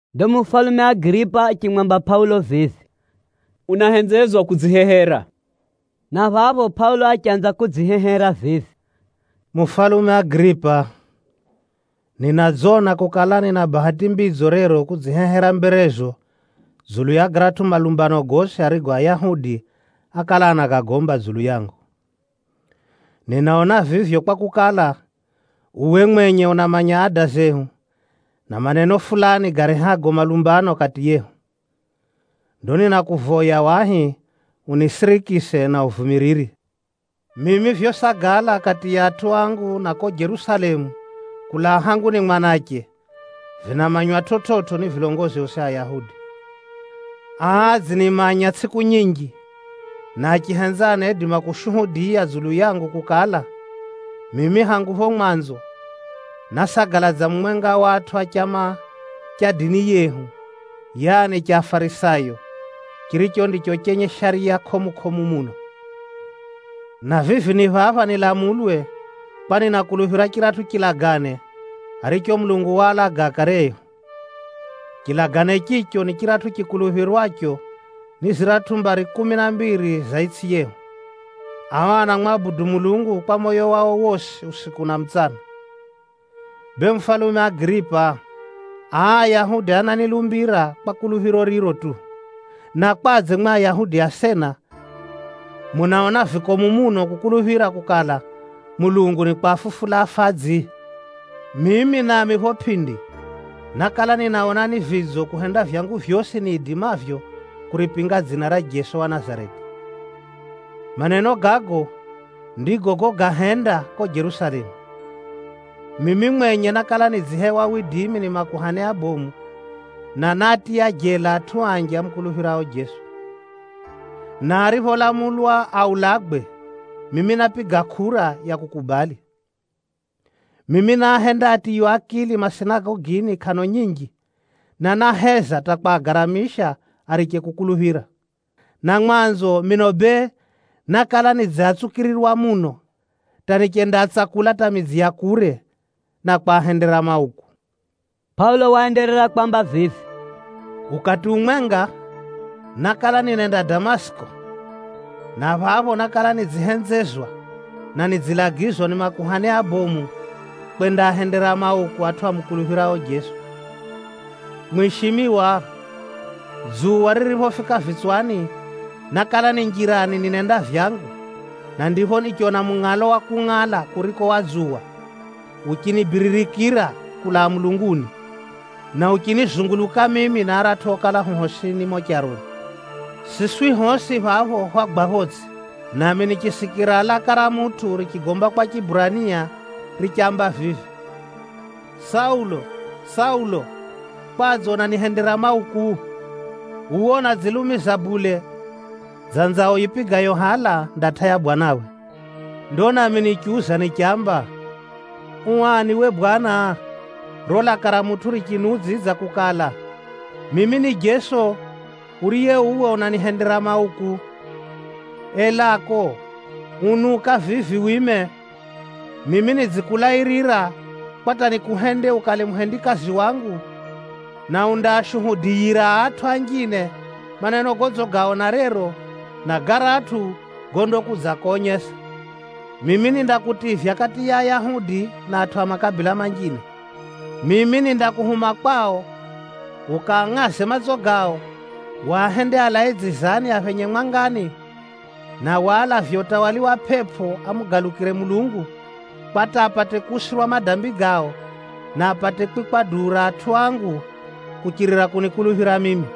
Ndo mufalume Agiripa achimwamba Pʼaulo vivi, “Unahenzezwa kudzihehera.” Na phapho Pʼaulo achanza kudzihehera vivi, “Mufalume Agiripa, ninadzona kukala, nina bahati mbidzo rero kudzihehera mberezo dzulu ya garatʼu malumbano gosi garigo Ayahudi ákala anagomba dzulu yangu. Ninaona vivyo kwakukala, uwe mwenye unamanya ada zehu, na maneno fulani garehago malumbano kati yehu. Ndo ninakuvoya wahi unisirikise na uvumiriri. “Mimi vyosagala kati ya atʼu angu na ko Jerusalemu kulaa hangu ni mwanache, vinamanywa chividzo ni vilongozi osi a Ayahudi. Aa adzinimanya tsʼiku nyinji, na achihenza anaidima kushuhudiya dzulu yangu kukala, mimi hangu pho mwanzo, násagala dza mumwenga wa atʼu a chama cha dini yehu, yaani cha Afarisayo, chiricho ndicho chenye shariya kʼomu-kʼomu muno. Na vivi ni phapha nilamulwe, kwa ninakuluphira chiratʼu chilagane aricho Mulungu waalaga akare ehu. Chilagane chicho ni chiratʼu chikuluphirwacho ni ziratʼu mbari kumi na mbiri za itsʼi yehu. Ao anamwabudu Mulungu kwa moyo wao wosi usiku na mutsana. Bee mufalume Agiripa, aa Ayahudi ananilumbira kwa kuluphiro riro tu! Na kwadze mwi Ayahudi asena munaona vikomu muno kukuluphira kukala, Mulungu nikwafufula afadzi? “Mimi nami pho pʼindi, nákala ninaona ni vidzo kuhenda vyangu vyosi niidimavyo kuripinga dzina ra Jeso wa Nazareti. Maneno gago ndigo gago gahenda ko Jerusalemu. Mimi mwenye nákala nidzihewa widimi ni makuhani abomu, na náatiya jela atʼu anji amukuluphirao Jeso. Na aripholamulwa aulagwe, mimi nápiga kʼura ya kukubali. Mimi náahenda atiywe akili masinagogini kʼano nyinji, na náheza hata kwagaramisha ariche kukuluphira. Na mwanzo mino bee, nákala nidziatsukirirwa muno hata nichendaatsakula hata midzi ya kure, na kwahendera mauku.” Pʼaulo waenderera kwamba vivi, “Ukati umwenga, nákala ninenda Damasiki, na phapho nákala nidzihenzezwa, na nidzilagizwa ni makuhani abomu, kwendaahendera mauku atʼu amukuluphirao Jeso. Mwishimiwa, dzuwa ririphofika vitswani, nákala ni njirani ninenda vyangu, na ndipho nichona mungʼalo wa kungʼala kuriko wa dzuwa, uchinibiririkira kulaa mulunguni, na uchinizunguluka mimi na aratʼu okala hu hosini mumo charoni. Siswi hosi phapho hwagwa photsʼi, nami nichisikira laka ra mutʼu richigomba kwa Chiburania richamba vivi, ‘Saulo, Saulo! Kwadze unanihendera mauku? Uwe unadzilumiza bule dza nzao yipigayo hala ndatʼa ya bwanawe.’ Ndo nami nichiuza nichamba, ‘U ani we bwana?’ Riro laka ra Bwana richiniudzidza richinamba, ‘Mimi ni Jeso, ariye uwe unanihendera mauku. Elako, unuka vivi wime! Mimi nidzikulairira, kwa hata nikuhende ukale muhendikazi wangu, na undaashuhudiyira atʼu anjine maneno godzigaona rero, na garatʼu gondakudzakonyesa. Mimi nindakutivya kati ya Ayahudi, na atʼu a makabila manjine. Mimi nindakuhuma kwao, ukaangʼaze matso gao, wahende alae dzizani aphenye mwangani, na walavye utawala wa Shetani amugalukire Mulungu, kwa hata apate kusamehewa madambi gao, na apate kwikwa duu ra atʼu angu, kuchirira kunikuluphira mimi.’”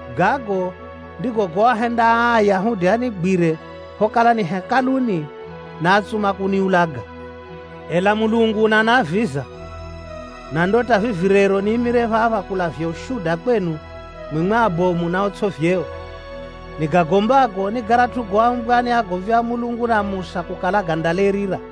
Gago ndigo goahenda aa Ayahudi anigwire phokala ni Hekaluni, na átsuma kuniulaga. Ela Mulungu unaniaviza, na ndo hata vivi rero niimire phapha kulavya ushuda kwenu, mwimwi abomu na otsʼi vyeo. Nigagombago ni garatʼu goambwa ni agomvi a Mulungu na Musa kukala, gandalairira.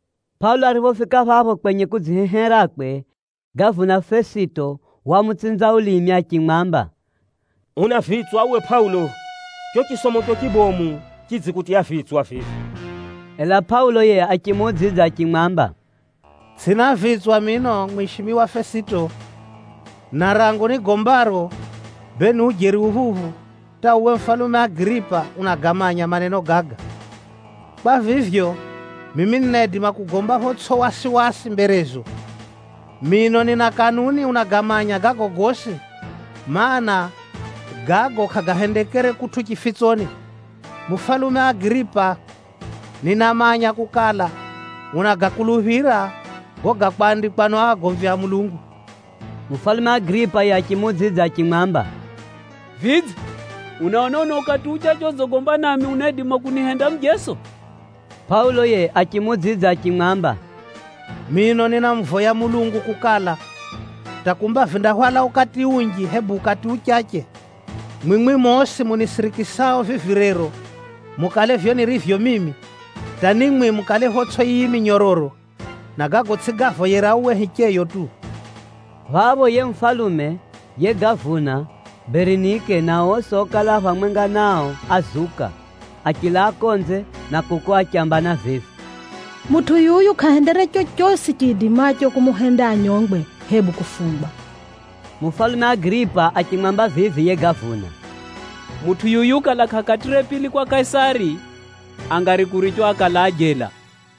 Pʼaulo ariphofika phapho kwenye kudziheherakwe, gavuna Fesito wamutsinza ulimi achimwamba, “Una vitswa uwe Pʼaulo! Cho chisomocho chibomu chidzikutiya vitswa vivi.” Ela Pʼaulo yiye achimuudzidza achimwamba, “Tsʼina vitswa mino, mwishimiwa Fesito. Na rangu nigombaro, bee ni ujeri uphuphu, hata uwe mufalume Agiripa unagamanya maneno gaga. Kwa vivyo, mimi ninaidima kugomba photsʼi wasiwasi mberezo. Mino nina kanuni unagamanya gago gosi, mana, gago kʼagahendekere kutʼu chifitsoni. Mufalume Agiripa, ninamanya kukala, unagakuluphira gago gákwandikwa ni o agomvi a Mulungu.” Mufalume Agiripa yiye achimuudzidza achimwamba, “Vidze, unaona uno ukati uchache odzigomba nami unaidima kunihenda mujeso?” Pʼaulo yiye achimuudzidza achimwamba, “Mino ninamuvoya Mulungu kukala, hata kumba vindahwala ukati unji, hebu ukati uchache, mwimwi mosi munisirikisao vivi rero, mukale vivyo nirivyo mimi, hata ni mwi mukale photsʼi yiyi minyororo, na gago tsʼigavoyera uwe hicheyo tu!” Phapho yiye mufalume, yiye gavuna, Berinike na osi okala a phamwenga nao ázuka, achilaa konze, na kuko achambana vivi, “Mutʼu yuyu kʼahendere chochosi chiidimacho kumuhenda anyongwe, hebu kufungwa.” Mufalume Agiripa achimwamba vivi yiye gavuna, “Mutʼu yuyu kala kʼakatʼire pili kwa Kaisari, angari kurichwa akalaa jela.”